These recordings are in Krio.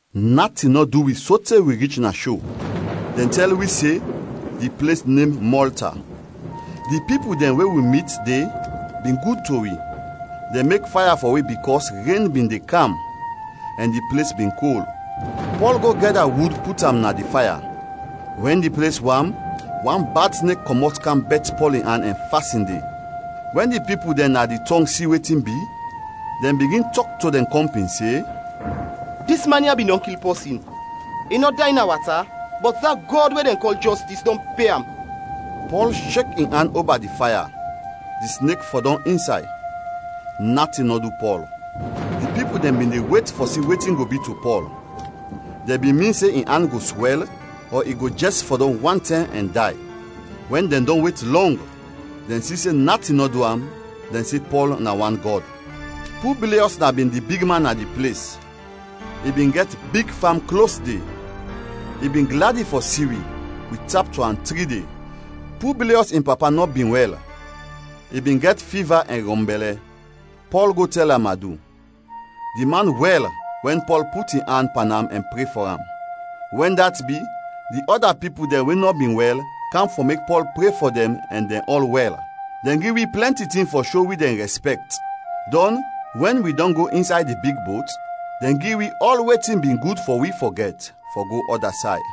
Natin nɔ du wi sote wi rich na sho; dɛn tɛl wi se di ples nem Mɔlta. Di pipul dɛn we wi mit de bin gud to wi, dɛn mek faya fɔ wi bikɔs ren bin de kam ɛn di ples bin kol. Pɔl go gɛda wud put am na di faya. Wɛn di ples wam, wan bad snek kɔmɔt kam bɛt Pɔl in an ɛn fasin de. Wɛn di pipul dɛn na di tɔng si wetin bi, dɛn bigin tɔk to dɛn kɔmpin se, “Dis man ya bin dɔn kil pɔsin. I nɔ day na wata bɔt da gɔd we dɛn kɔl Jɔstis dɔn pe am!” Pɔl shek in an oba di faya, di snek fɔdɔm insay; natin nɔ du Pɔl. Di pipul dɛn bin de wet fɔ si wetin go bi to Pɔl. Dɛn bin min se in an go swɛl ɔ i go jɛs fɔdɔm wantɛm ɛn day. Wɛn dɛn dɔn wet lɔng, dɛn si se natin nɔ du am, dɛn se Pɔl na wan gɔd. Publiɔs na bin di bigman na di ples, i bin gɛt big fam klos de. I bin gladi fɔ si wi; wi tap to am tri de. Publiɔs in papa nɔ bin wɛl, i bin gɛt fiva ɛn rɔnbɛlɛ. Pɔl go tɛl am adu. Di man wɛl wɛn Pɔl put in an pan am ɛn pre fɔ am. Wɛn dat bi, di ɔda pipul dɛn we nɔ bin wɛl kam fɔ mek Pɔl pre fɔ dɛn ɛn dɛn ɔl wɛl. Dɛn gi wi plɛnti tin fɔ sho wi dɛn rɛspɛkt, dɔn, wɛn wi dɔn go insay di big bot, dɛn gi wi ɔl wetin bin gud fɔ wi fɔ gɛt, fɔ go ɔda say.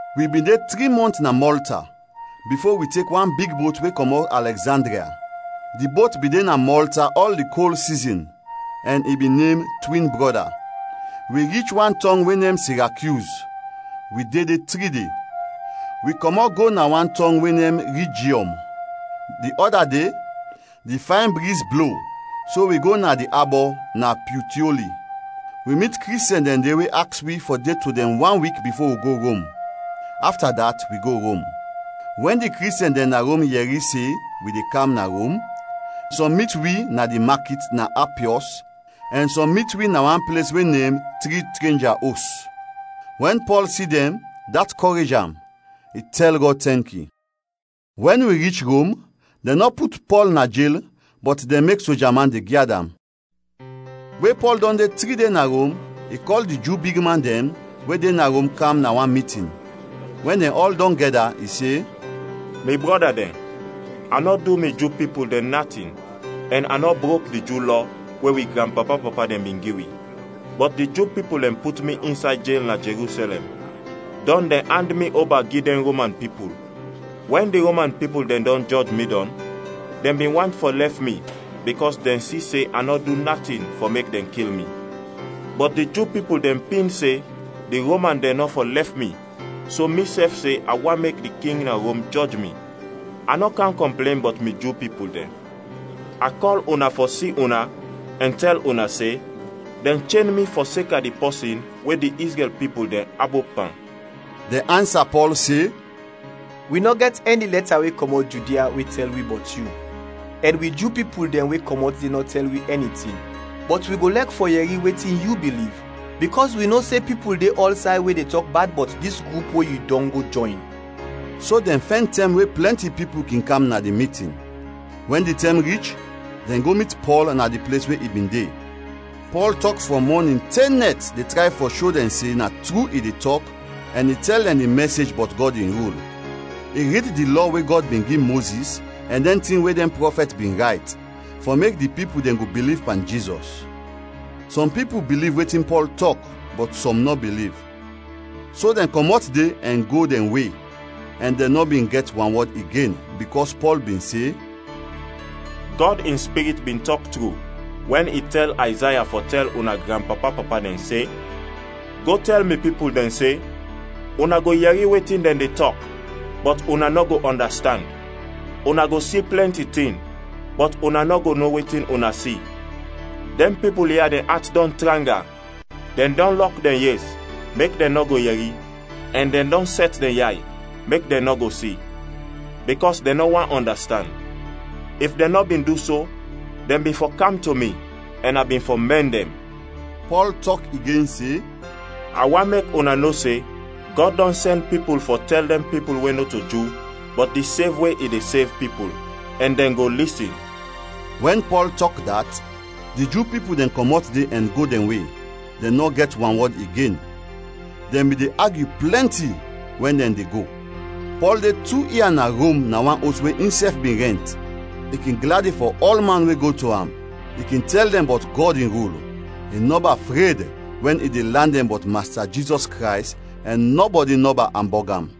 Wi bin de tri mɔnt na Mɔlta, bifo wi tek wan big bot we kɔmɔt Alɛgzandria. Di bot bin de na Mɔlta ɔl di kol sizin, ɛn i bin nem Twin Brɔda. Wi rich wan tɔng we nem Sirakyuz; wi de de tri de. Wi kɔmɔt de go na wan tɔng we nem Rijiɔm. Di ɔda de di fayn briz blo so wi go na di abɔ na Pyutioli. Wi mit Kristiɛn dɛn de we aks wi fɔ de to dɛn wan wik bifo wi go Rom. Afta dat wi go Rom. Wɛn di Kristiɛn dɛn na Rom yɛri se wi de kam na Rom, sɔm mit wi na di makit na Apiɔs ɛn sɔm mit wi na wan ples we nem Tri Trenja Os. Wɛn Pɔl si dɛn, dat kɔrej am, i tɛl Gɔd tɛnki. Wɛn wi rich Rom, dɛn nɔ put Pɔl na jel bɔt dɛn mek soja man de gyad am. We Pɔl dɔn de tri de na Rom, i kɔl di Ju bigman dɛn we de na Rom kam na wan mitin. Wɛn dɛn ɔl dɔn gɛda, i se, “Mi brɔda dɛn, a nɔ du mi Ju pipul dɛn natin ɛn a nɔ brok di Ju Lɔ we wi granpapa-papa dɛn bin gi wi. Bɔt di Ju pipul dɛn put mi insay jel na Jerusɛlɛm, dɔn dɛn and mi oba gi dɛn Roman pipul. Wɛn di Roman pipul dɛn dɔn jɔj mi dɔn, dɛn bin want fɔ lɛf mi bikɔs dɛn si se a nɔ du natin fɔ mek dɛn kil mi. Bɔt di Ju pipul dɛn pin se di Roman dɛn nɔ fɔ lɛf mi so misɛf se a want mek di king na Rom jɔj mi. A nɔ kam kɔmplen bɔt mi Ju pipul dɛn. A kɔl una fɔ si una ɛn tɛl una se dɛn chen mi fɔseka di pɔsin we di Izrɛl pipul dɛn abop pan.” Dɛn ansa Pɔl se, “Wi nɔ gɛt ɛni lɛta we kɔmɔt Judia we tɛl wi bɔt yu ɛn wi Ju pipul dɛn we kɔmɔt de nɔ tɛl wi ɛni tin. Bɔt wi go lɛk fɔ yɛri wetin yu biliv, bikɔs wi no se pipul de ɔlsay we de tɔk bad bɔt dis grup we yu dɔn go jɔyn.” So dɛn fɛn tɛm we plɛnti pipul kin kam na di mitin. Wɛn di tɛm rich, dɛn go mit Pɔl na di ples we i bin de. Pɔl tɔk frɔm mɔnin te nɛt de tray fɔ sho dɛn se na tru i de tɔk ɛn i tɛl dɛn di mɛsej bɔt Gɔd in rul. I rid di Lɔ we Gɔd bin gi Mozis ɛn dɛn tin we dɛn prɔfɛt bin rayt, fɔ mek di pipul dɛn go biliv pan Jizɔs. Sɔm pipul biliv wetin Pɔl tɔk, bɔt sɔm nɔ biliv. So dɛn kɔmɔt de ɛn go dɛn we ɛn dɛn nɔ bin gɛt wanwɔd igen, bikɔs Pɔl bin se, “Gɔd in Spirit bin tɔk tru wɛn i tɛl Ayzaya fɔ tɛl una granpapa-papa dɛn se, ‘Go tɛl mi pipul dɛn se: Una go yɛri wetin dɛn de tɔk, bɔt una nɔ go ɔndastand; Una go si plɛnti tin, bɔt una nɔ go no wetin una si. Dɛn pipul ya dɛn at dɔn tranga, dɛn dɔn lɔk dɛn yes mek dɛn nɔ go yɛri, ɛn dɛn dɔn sɛt dɛn yay mek dɛn nɔ go si, bikɔs dɛn nɔ want ɔndastand. If dɛn nɔ bin du so, dɛn bin fɔ kam to mi ɛn a bin fɔ mɛn dɛn.’” Pɔl tɔk igen se, “A want mek una no se, Gɔd dɔn sɛn pipul fɔ tɛl dɛn pipul we nɔto Ju bɔt di sev we i de sev pipul, ɛn dɛn go lisin!” [ Wɛn Pɔl tɔk dat, di Ju pipul dɛn kɔmɔt de ɛn go dɛn we, dɛn nɔ gɛt wanwɔd igen. Dɛn bin de agyu plɛnti wɛn dɛn de go.] Pɔl de tu ia na Rom na wan os we insɛf bin rɛnt. I kin gladi fɔ ɔlman we go to am. I kin tɛl dɛn bɔt Gɔd in rul. I nɔba fred wɛn i de lan dɛn bɔt Masta Jizɔs Krays ɛn nɔbɔdi nɔba ambɔg am.